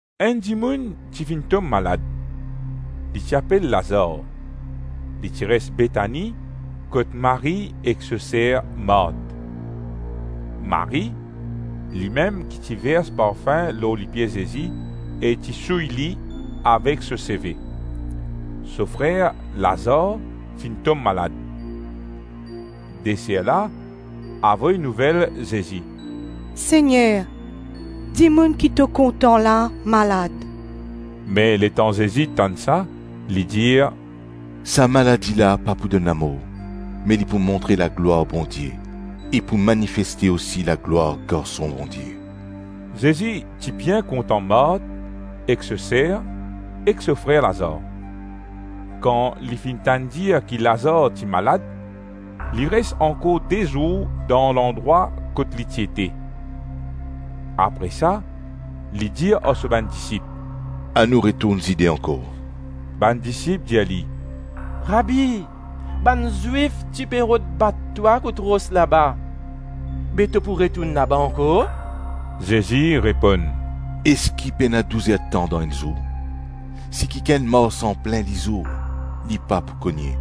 Enn dimoun ti finn tom malad. Li ti apel Lazar; li ti res Betani kot Marie ek so ser Mart. Marie, limem ki ti vers parfin lor lipie Zezi e ti souy li avek so seve; so frer Lazar finn tom malad. De ser la avoy nouvel Zezi, “Segner, dimoun ki to kontan la malad.” Me letan Zezi tann sa, li dir, “Sa maladi la pa pou donn lamor, me li pou montre laglwar Bondie e pou manifeste osi laglwar Garson Bondie.” Zezi ti bien kontan Mart ek so ser, ek so frer Lazar. Kan li finn tann dir ki Lazar ti malad, li res ankor de zour dan landrwa kot li ti ete. Apre sa li dir ar so bann disip, “Anou retourn Zide ankor.” Bann disip dir li, “Rabi, bann Zwif ti pe rod bat twa kout ros laba, be to pou retourn laba ankor?” Zezi reponn, “Eski pena douzer-tan dan enn zour? Si kikenn mars anplin lizour, li pa pou kogne,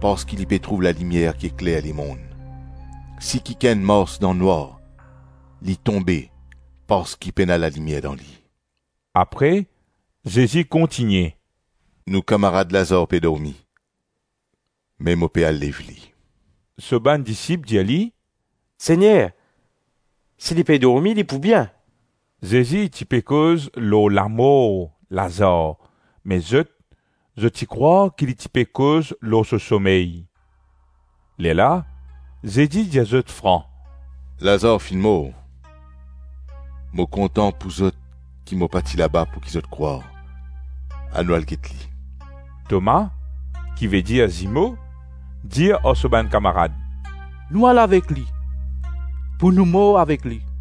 parski li pe trouv lalimier ki ekler lemonn. Si kikenn mars dan nwar, li tonbe, parski pena lalimier dan li.” Apre Zezi kontigne, “Nou kamarad Lazar pe dormi, me mo pe al lev li.” So bann disip dir li, “Segner, si li pe dormi, li pou bien.” Zezi ti pe koz lor lamor Lazar me zot, zot ti krwar ki li ti pe koz lor so somey. Lerla Zezi dir zot fran, “Lazar finn mor.” Mo kontan pou zot ki mo pa ti laba pouki zot krwar. Anou al get li.” Toma, ki vedir zimo, dir ar so bann kamarad, “Nou al avek li, pou nou mor avek li.”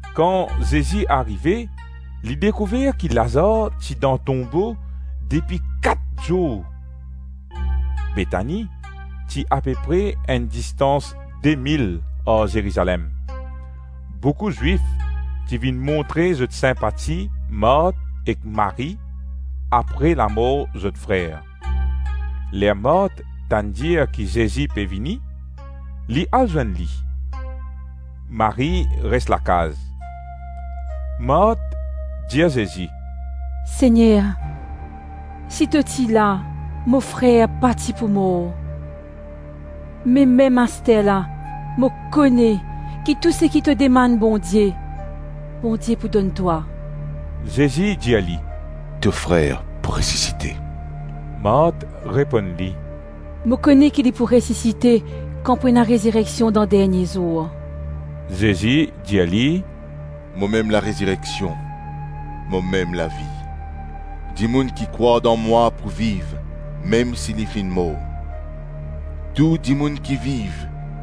Kan Zezi arive, li dekouver ki Lazar ti dan tonbo depi kat zour. Betani ti ape pre enn distans de mil ar Zerizalem. Boukou Zwif ti vinn montre zot sinpati Mart ek Marie apre lamor zot frer. Ler Mart tann dir ki Zezi pe vini, li al zwenn li. Marie res lakaz. Mart dir Zezi, “Segner, si to ti la, mo frer pa ti pou mor. Me mem asterla mo kone ki tou seki to demann Bondie, Bondie pou donn twa.” Zezi dir li, “To frer pou resisite.” Mart reponn li, “Mo kone ki li pou resisite kan pou ena rezireksion dan dernie zour.” Zezi dir li, “Momem larezireksion, momem lavi; dimoun ki krwar dan mwa pou viv mem si li finn mor. Tou dimoun ki viv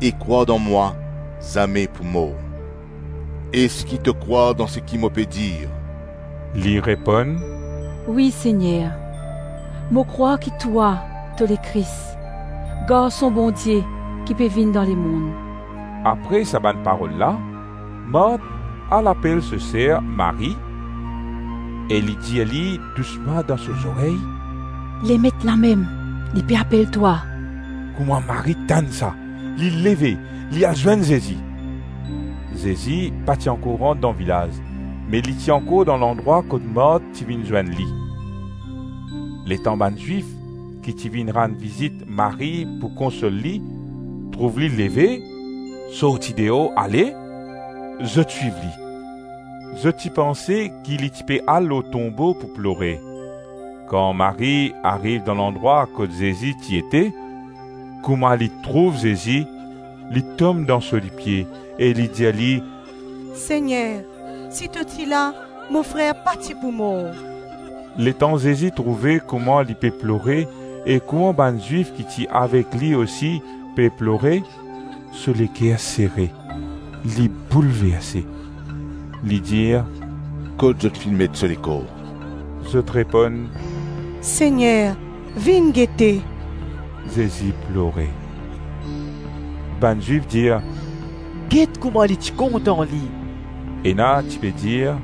e krwar dan mwa zame pou mor; eski to krwar dan seki mo pe dir?” Li reponn, “Wi Segner, mo krwar ki twa, to Lekris, Garson Bondie ki pe vinn dan lemonn.” Apre sa bann parol la, Mart al apel so ser Marie e li dir li dousman dan so zorey, “Lemet lamem, li pe apel twa.” Kouma Marie tann sa, li leve, li al zwenn Zezi. Zezi pa ti ankor rant dan vilaz me li ti ankor dan landrwa kot Mart ti vinn zwenn li. Letan bann Zwif, ki ti vinn rann vizit Marie pou konsol li, trouv li leve, sorti deor ale, zot swiv li. Zot ti panse ki li ti pe al lor tonbo pou plore. Kan Marie ariv dan landrwa kot Zezi ti ete, kouma li trouv Zezi, li tom dan so lipie e li dir li, “Segner, si to ti la, mo frer pa ti pou mor.” Letan Zezi trouve kouma li pe plore e kouma bann Zwif ki ti avek li osi pe plore, so leker sere, li boulverse. Li dir, “Kot zot finn met so lekor?” Zot reponn, “Segner, vinn gete.” Zezi plore. Bann Zwif dir, “Get kouma li ti kontan li.” Ena ti pe dir,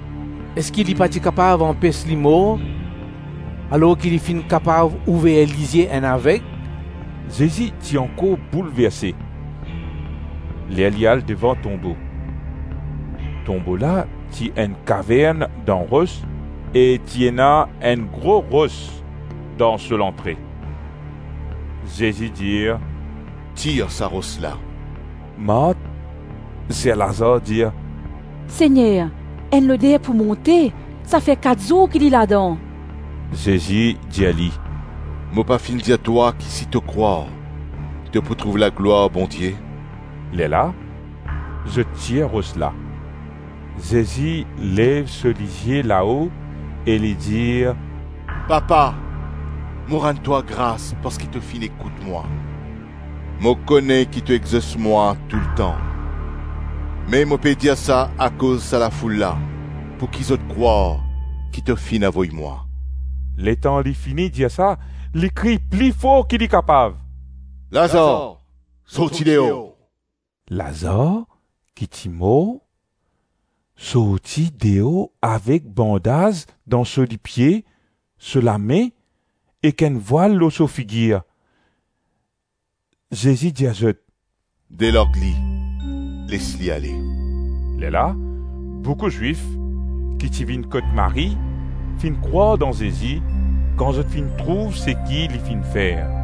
“Eski li pa ti kapav anpes li mor alors ki li finn kapav ouver lizie enn aveg?” Zezi ti ankor boulverse, ler li al devan tonbo. Tonbo la ti enn kavern dan ros e ti ena enn gro ros dan so lantre. Zezi dir, “Tir sa ros la.” Mart, ser Lazar dir, “Segner, enn loder pou monte; sa fer kat zour ki li ladan.” Zezi dir li, “Mo pa finn dir twa ki si to krwar to pou trouv laglwar Bondie?” Lerla zot tir ros la. Zezi lev so lizie lao e li dir, “Papa, mo rann twa gras parski to finn ekout mwa. Mo kone ki to exos mwa toultan me mo pe dir sa akoz sa lafoul la, pouki zot krwar ki to finn avoy mwa.” Letan li fini dir sa, li kriy pli for ki li kapav, “Lazar, sorti deor!” Lazar ki ti mor, sorti deor avek bandaz dan so lipie, so lame, ek enn vwal lor so figir. Zezi dir zot, “Delarg li, les li ale.” Lerla boukou Zwif, ki ti vinn kot Marie, finn krwar dan Zezi kan zot finn trouv seki li finn fer.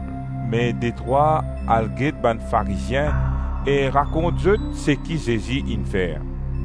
Me detrwa al get bann Farizien e rakont zot seki Zezi inn fer.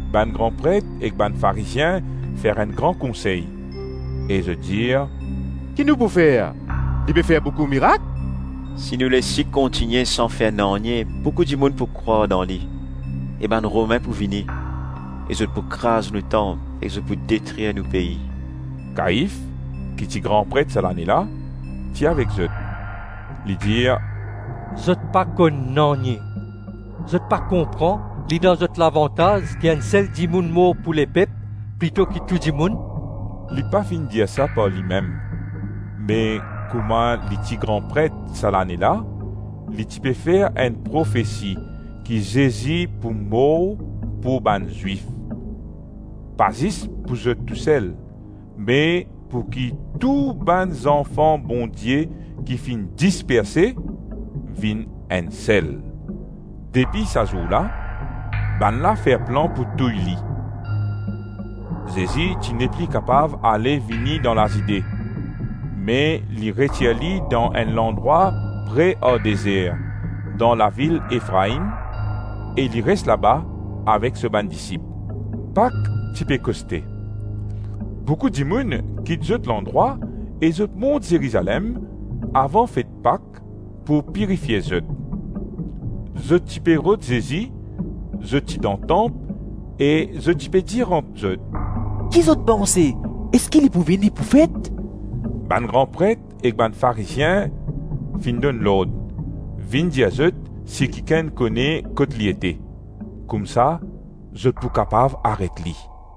Bann gran pret ek bann Farizien fer enn gran konsey e zot dir “Ki nou pou fer? Li pe fer boukou mirak? Si nou les li kontigne san fer nanye, boukou dimoun pou krwar dan li e bann Romin pou vini e zot pou kraz nou tanp ek zot pou detrir nou pei.” Kaif, ki ti gran pret sa lane la, ti avek zot. Li dir, “Zot pa konn nanye, Zot pa konpran, li dan zot lavantaz ki enn sel dimoun mor pou lepep plito ki tou dimoun.” Li pa finn dir sa par limem me kouma li ti gran pret sa lane la, li ti pe fer enn profesi ki Zezi pou mor pou bann Zwif; Pa zis pou zot tou sel, me pouki tou bann zanfan Bondie ki finn disperse, vinn enn sel. Depi sa zour la, bannla fer plan pou touy li. Zezi ti nepli kapav ale-vini dan Lazide, me li retir li dan enn landrwa pre ar dezer, dan lavil Efraim e li res laba avek so bann disip. Pak ti pe koste. Boukou dimoun kit zot landrwa e zot mont Zerizalem avan fet Pak pou pirifie zot. Zot ti pe rod Zezi; zot ti dan tanp e zot ti pe dir ant zot, “Ki zot panse? Eski li pou vini pou fet?” Bann gran pret ek bann Farizien finn donn lord, vinn dir zot si kikenn kone kot li ete, koumsa zot pou kapav aret li.